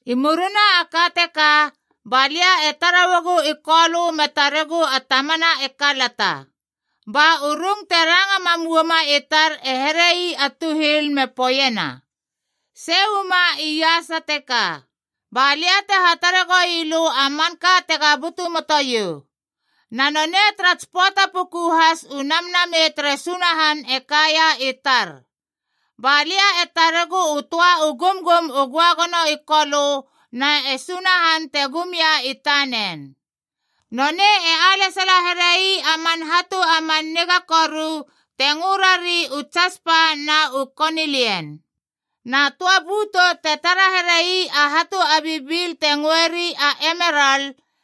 I murina a ka teka, balia e tara uagu i Kolö me taregu a tamana e kalata. Ba u rung te ranga mam uama i tar e here ii a tuhil a me poeiena, “Sei uama iasa teka, balia te hatare goi lö a manka tega butu moto iou.” Na nonei tara tsi pöata puku has u Namnamei tere Sunahan e kaia i tar. Ba lia e taregu u töa u gumgum u göagono i Kolö na e Sunahan te gum ia i tanen. Nonei e alesala here ii a man hatu a man niga koru te ngö rari u tsaspa b na u konilian.c Na töa bötou, te tara here ii a hatu a bibil te ngöeri a emeral,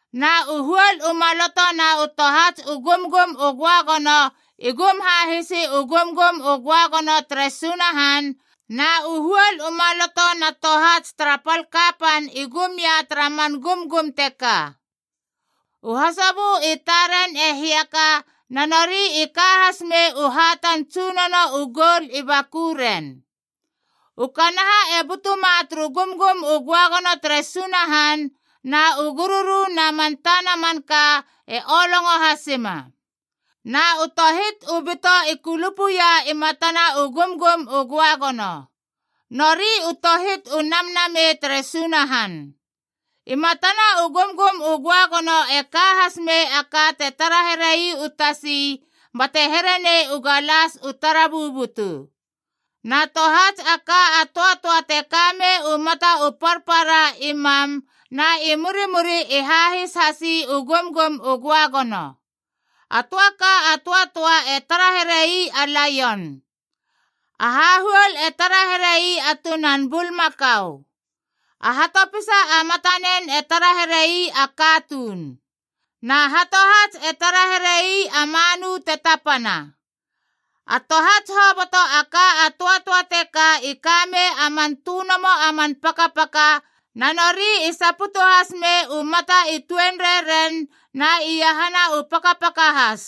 Na u huol u maloto na u tohats u gumgum u göagono i gum hahisi u gumgum u göagono tere Sunahan, na u huol u maloto na tohats tara pal kapan i gum ia tara man gumgum teka. U hasobö i taren e hiaka na nori i ka has mei u hatan tsunono u goul i bakuren. U kanaha e butuma turu gumgum u göagono tere Sunahan, na u gururu na man tana manka e olongo hasima. Na u tohit u bito i kulupuia i matana u gumgum u göagono. Nori u tohit u namnamei tere Sunahan. I matana u gumgum u göagono e ka hasmei a ka te tara here ii u tasi bate here nei u galas u tara bubutu. Na tohats a ka a töatöa te ka mei u mata u parpara i mam na i murimuri e hahis hasi u gumgum u Göagono. A töa ka a töatöa e tara here ii a laion. A hahuol e tara here ii a tunan bulmakau. A hatopisa a matanen e tara here ii a katuun. Na hatohats e tara here ii a manu te tapana. A tohats hoboto a ka a töatöa teka i ka mei a man tönomo a man pakapaka, na nori i saputu has mei u mata i tuenrei ren na iahana u pakapaka has.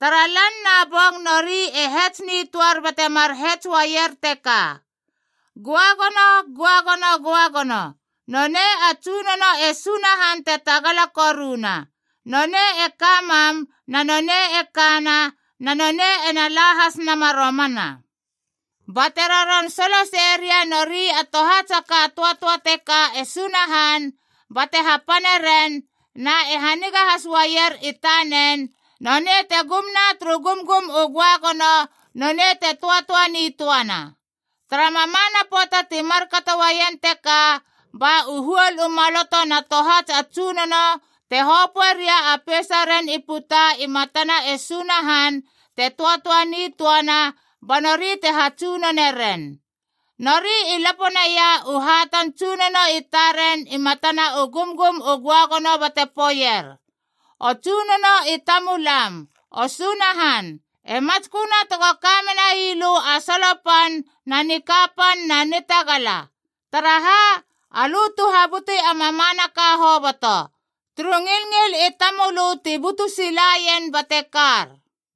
Tara lan na bong nori e hets nitöar bate mar hets uaier teka: “Göagono, göagono, göagono Nonei a Tsunono e Sunahan te Tagala Koruna. Nonei e ka mam, na nonei e kana, Na nonei ena la has nama romana.” Ba te roron solosei ria nori a tohats a ka a töatöa teka e Sunahan bate hapane ren na e haniga has uaier i tanen, nonei te gum na turu gumgum u göagono, nonei te töatöa nitöana. Tara mamana pöata ti markato uaien teka, ba u huol u maloto na tohats a tsunono te hopöe ria a peisaren i puta i matana e Sunahan te töatöa nitöana ba nori te hatsunone ren. Nori i lapo naia u hatan tsunono i taren i matana u gumgum u göagono bate poeier, “O Tsunono i tamulam, O Sunahan, E matsköna tego ka menai lö a solo pan na nikapan na nitagala. Taraha? Alö tu habuti a mamanaka hoboto. Turu ngilngil i tamölö ti butu silaien bate kar.”